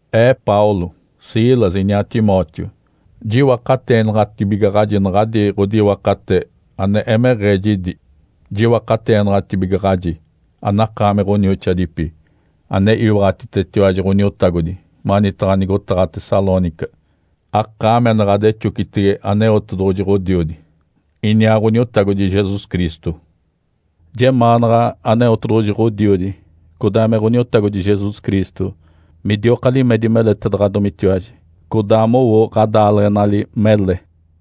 Ee Paulo, Silas, iniaa Timóteo, jiwakateenaɡ̶atibigaɡ̶aji naɡ̶adi ɡ̶odiwakate ane emeɡ̶ee jidi. Jiwakateenaɡ̶atibigaɡ̶aji anakaami ɡ̶onioxoadipi, ane iwaɡ̶atitetiwaji Ǥoniotagodi manitaɡ̶a nigotaɡ̶a Tessalônica, akaami ane ɡ̶adexocitege Aneotedoɡ̶oji Ǥodiodi, iniaa Ǥoniotagodi Jesus Cristo. Jemaanaɡ̶a Aneotedoɡ̶oji Ǥodiodi, codaa me Ǥoniotagodi Jesus Cristo midioka limedi meletaɡ̶adomitiwaji, codaa mowo ɡ̶adaaleɡ̶enali mele.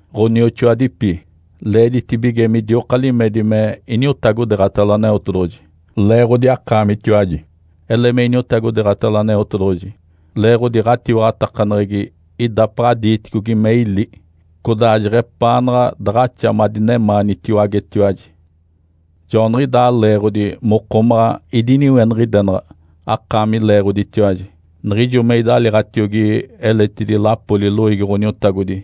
Ǥonioxoadipi. Leeditibige midioka limedi me iniotagodeeɡ̶atalo Aneotedoɡ̶oji, leeɡ̶odi akaamitiwaji. Ele me iniotagodeeɡ̶atalo Aneotedoɡ̶oji, leeɡ̶odi ɡ̶atiwaɡ̶atakaneɡ̶egi idapaɡ̶a diiticogi me ili, codaa jeɡ̶epaanaɡ̶a daɡ̶axa madinemaanitiwagetiwaji. Joaniɡ̶idaa leeɡ̶odi mokomaɡ̶a idiniweniɡ̶idenaɡ̶a akaami leeɡ̶oditiwaji niɡ̶ijo me idaliiɡ̶atiogi eletidi lapoli loiigi Ǥoniotagodi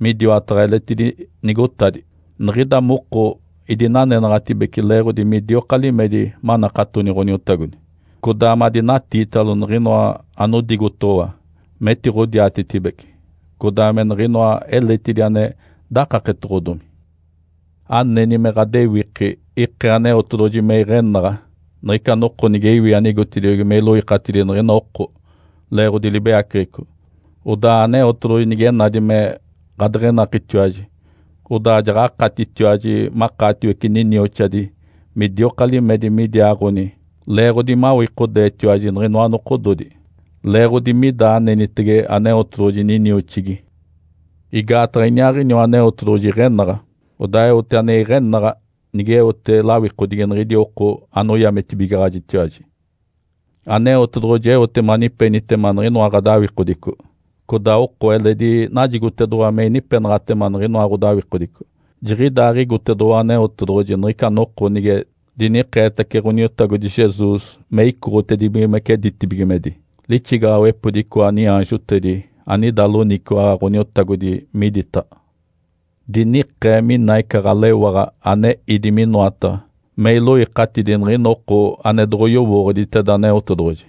midiwataɡ̶a eletidi nigotadi. Niɡ̶ida moko idinanenaɡ̶atibece leeɡ̶odi midioka limedi manakatoni Ǥoniotagodi, codaa madinatiitalo niɡ̶inoa anodigotoɡ̶owa metiɡ̶odiatetibeci codaa me niɡ̶inoa eletidi ane dakaketoɡ̶odomi. Aneni me ɡ̶adewiki ikee Aneotedoɡ̶oji me iɡ̶enaɡ̶a niɡ̶ica noko nige iwi anigotediogi me iloikatidi niɡ̶ina oko leeɡ̶odi libeyaceɡ̶eco. Odaa Aneotedoɡ̶oji nige nadi me ɡ̶adeɡ̶enakitiwaji, odaa jaɡ̶akatitiwaji makaatiwece ninioxadi midioka limedi midiaaɡ̶oni. Leeɡ̶odi mawikodeetiwaji niɡ̶inoa nokododi leeɡ̶odi mida anenitege Aneotedoɡ̶oji ninioxigi. Igaataɡ̶a iniaaɡ̶iniwa Aneotedoɡ̶oji iɡ̶enaɡ̶a, odaa eote ane iɡ̶enaɡ̶a, nigeote lawikodigi niɡ̶idi oko anoyametibigaɡ̶ajitiwaji. Aneotedoɡ̶oji eote manipenitema niɡ̶inoa ɡ̶adawikodico, codaa oko eledi najigotedoɡ̶owa me inipenaɡ̶atema niɡ̶inoa ɡ̶odawikodico. Jiɡ̶idaaɡ̶igotedoɡ̶owa Aneotedoɡ̶oji niɡ̶ica noko nige dinikeetace Ǥoniotagodi Jesus me icoɡ̶otedibigimece ditibigimedi, lixigaɡ̶awepodi icoa niaanjotedi anida loniciwaɡ̶a Ǥoniotagodi miditaɡ̶a. Dinikee mina ica ɡ̶alewaɡ̶a ane ídi minoataɡ̶a me iloikatidi niɡ̶ina oko ane doɡ̶oyowooɡ̶oditeda Aneotedoɡ̶oji,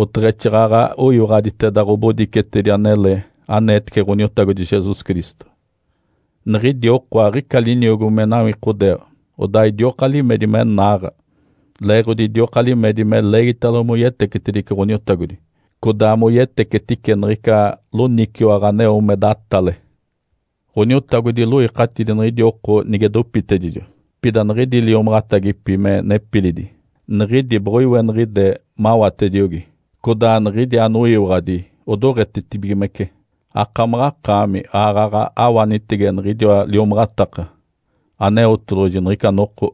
oteɡ̶exaaɡ̶aɡ̶a oyiwaɡ̶aditeda ɡ̶obodicetedi anele aneetece Ǥoniotagodi Jesus Cristo. Niɡ̶idi oko aɡ̶ica liniogo me nawikodeeɡ̶a, odaa idioka limedi me naaɡ̶a, leeɡ̶odi idioka limedi me leegitalo moyetecetedice Ǥoniotagodi, codaa moyetecetice niɡ̶ica loniciwaɡ̶a aneo me datale. Ǥoniotagodi iloikatidi niɡ̶idi oko nige dopitedijo. Pida niɡ̶idi liomaɡ̶atagipi me nepilidi, niɡ̶idi boɡ̶oiweniɡ̶ide mawatediogi, codaa niɡ̶idi anoyiwaɡ̶adi odoɡ̶etetibigimece. Akamaɡ̶akaami aaɡ̶aɡ̶a awanitege niɡ̶idiwa liomaɡ̶ataka Aneotedoɡ̶oji niɡ̶ica noko,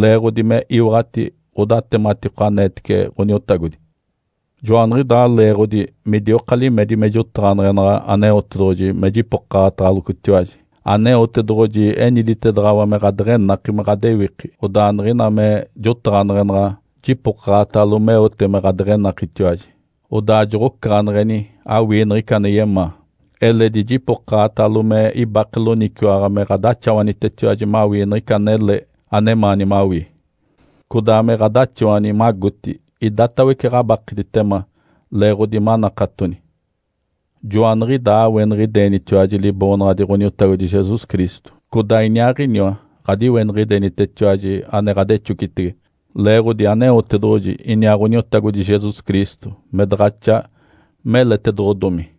leeɡ̶odi me iwaɡ̶ati ɡ̶odatematiko aneetece Ǥoniotagodi. Joaniɡ̶idaa leeɡ̶odi midioka limedi me jotaɡ̶aneɡ̶enaɡ̶a Aneotedoɡ̶oji me jipokaɡ̶ataɡ̶alocotiwaji. Aneotedoɡ̶oji eniditedaɡ̶awa me ɡ̶adeɡ̶enaki me ɡ̶adewiki, odaa niɡ̶ina me jotaɡ̶aneɡ̶enaɡ̶a, jipokaɡ̶atalo meote me ɡ̶adeɡ̶enakitiwaji, odaa joɡ̶ocaɡ̶aneɡ̶eni awii niɡ̶ica ane yemaa. Eledi jipokaɡ̶atalo me ibake loniciwaɡ̶a me ɡ̶adaxawanitetiwaji mawii niɡ̶ica anele anemaani mawii, codaa me ɡ̶adaxawani magoti idatawece ɡ̶abakeditema leeɡ̶odi manakatoni. Joaniɡ̶idaa aweniɡ̶idenitiwaji Liboonaɡ̶adi Ǥoniotagodi Jesus Cristo, codaa Iniaaɡ̶iniwa ɡ̶adiweniɡ̶idenitetiwaji ane ɡ̶adexocitege, leeɡ̶odi Aneotedoɡ̶oji iniaa Ǥoniotagodi Jesus Cristo me daɡ̶axa meletedoɡ̶odomi.